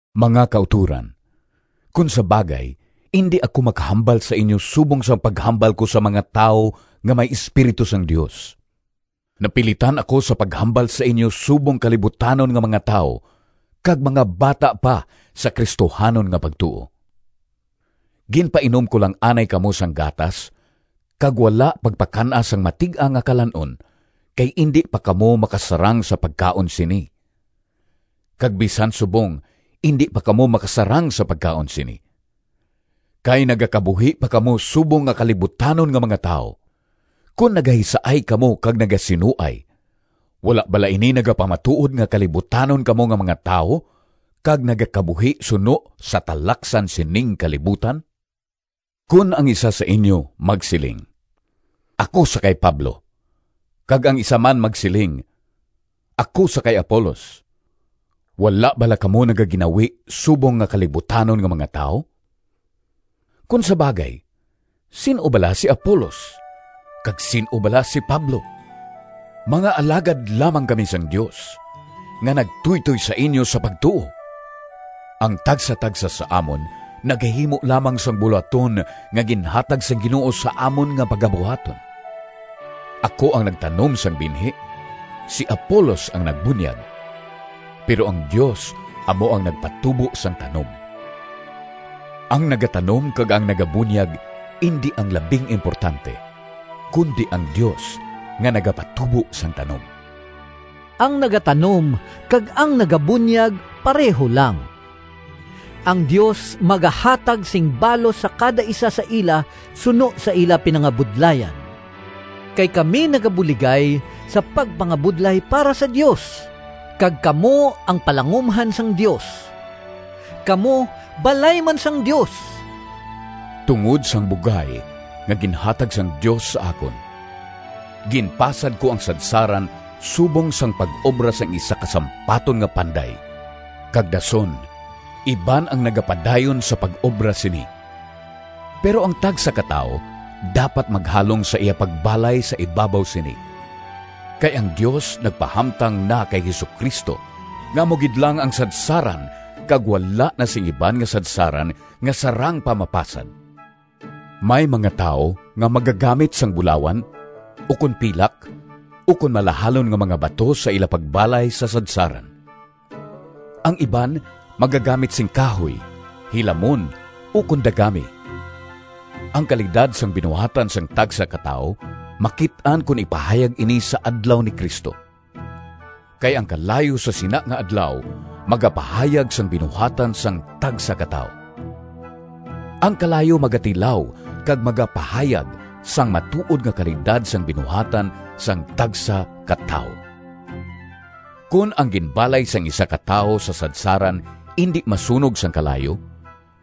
Mga kautoran, kon sa bagay, indi ako makahambal sa inyo subong sang paghambal ko sa mga tawo nga may Espiritu sang Dios. Napilitan ako sa paghambal sa inyo subong kalibutanon nga mga tawo kag mga bata pa sa Cristohanon nga pagtuo. Ginpainom ko lang anay kamo sang gatas, kag wala pagpakan-a sang matig-a nga kalan-on, kay indi pa kamo makasarang sa pagkaon sini. Kag bisan subong indi pa kamo makasarang sa pagkaon sini, kay nagakabuhi pa kamo subong nga kalibutanon nga mga tawo. Kon nagahisaay kamo kag nagasinuay, wala bala ini nagapamatuod nga kalibutanon kamo nga mga tawo kag nagakabuhi suno sa talaksan sining kalibutan? Kon ang isa sa inyo magsiling, “Ako sa kay Pablo,” kag ang isa man magsiling, “Ako sa kay Apolos,” wala bala kamo nagaginawi subong nga kalibutanon nga mga tawo? Kon sa bagay, sin-o bala si Apolos? Kag sin-o bala si Pablo? Mga alagad lamang kami sang Dios, nga nagtuytoy sa inyo sa pagtuo. Ang tagsatagsa sa amon nagahimo lamang sang bulohaton nga ginhatag sang Ginoo sa amon nga pagabuhaton. Ako ang nagtanom sang binhi, si Apolos ang nagbunyag, pero ang Dios amo ang nagpatubo sang tanom. Ang nagatanom kag ang nagabunyag indi ang labing importante, kundi ang Dios nga nagapatubo sang tanom. Ang nagatanom kag ang nagabunyag pareho lang. Ang Dios magahatag sing balos sa kada isa sa ila suno sa ila pinangabudlayan. Kay kami nagabuligay sa pagpangabudlay para sa Dios, kag kamo ang palangumhan sang Dios. Kamo balay man sang Dios. Tungod sang bugay nga ginhatag sang Dios sa akon, ginpasad ko ang sadsaran subong sang pag-obra sang isa ka sampaton nga panday kag dason iban ang nagapadayon sa pag-obra sini. Pero ang tagsa ka tawo dapat maghalong sa iya pagbalay sa ibabaw sini. Kay ang Dios nagpahamtang na kay Jesu-Cristo nga amo gid lang ang sadsaran kag wala na sing iban nga sadsaran nga sarang pa mapasad. May mga tawo nga magagamit sang bulawan, ukon pilak, ukon malahalon nga mga bato sa ila pagbalay sa sadsaran. Ang iban magagamit sing kahoy, hilamon, ukon dagami. Ang kalidad sang binuhatan sang tagsa ka tawo makit-an kon ipahayag ini sa Adlaw ni Cristo. Kay ang kalayo sa sina nga Adlaw magapahayag sang binuhatan sang tagsa ka tawo. Ang kalayo magatilaw kag magapahayag sang matuod nga kalidad sang binuhatan sang tagsa ka tawo. Kon ang ginbalay sang isa ka tawo sa sadsaran indi masunog sang kalayo,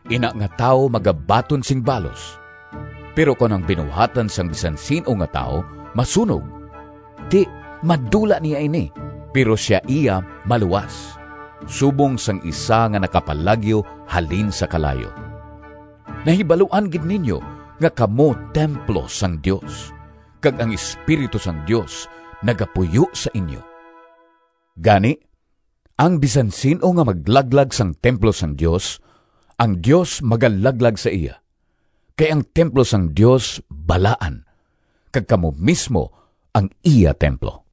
ina nga tawo magabaton sing balos. Pero kon ang binuhatan sang bisan sin-o nga tawo masunog, ti madula niya ini, pero sia iya maluwas, subong sang isa nga nakapalagyo halin sa kalayo. Nahibaluan gid ninyo nga kamo templo sang Dios, kag ang Espiritu sang Dios nagapuyo sa inyo! Gani, ang bisan sin-o nga maglaglag sang templo sang Dios, ang Dios magalaglag sa iya. Kay ang templo sang Dios balaan, kag kamo mismo ang iya templo.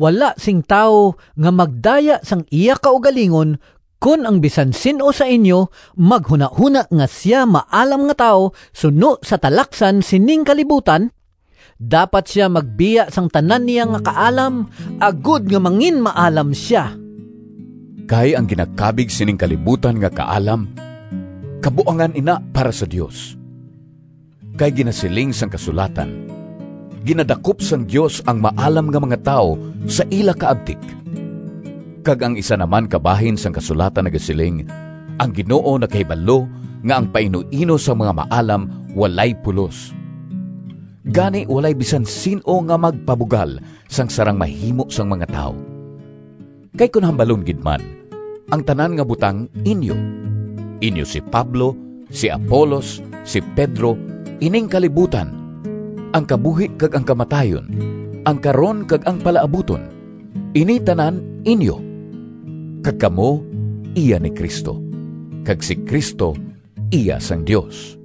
Wala sing tawo nga magdaya sang iya kaugalingon kon ang bisan sin-o sa inyo maghunahona nga sia maalam nga tawo suno sa talaksan sining kalibutan, dapat sia magbiya sang tanan niya nga kaalam, agod nga manginmaalam sia. Kay ang ginakabig sining kalibutan nga kaalam, kabuangan ina para sa Dios. Kay ginasiling sang kasulatan, “Ginadakop sang Dios ang maalam nga mga tawo sa ila kaabtik.” Kag ang isa na man ka bahin sang kasulatan nagasiling, “Ang Ginoo nakahibalo nga ang painuino sang mga maalam walay pulos.” Gani walay bisan sin-o nga magpabugal sang sarang mahimo sang mga tawo. Kay kon hambalon gid man, ang tanan nga butang inyo. Inyo si Pablo, si Apolos, si Pedro, ining kalibutan, ang kabuhi kag ang kamatayon, ang karon kag ang palaabuton. Ini tanan inyo, kag kamo iya ni Cristo, kag si Cristo iya sang Dios.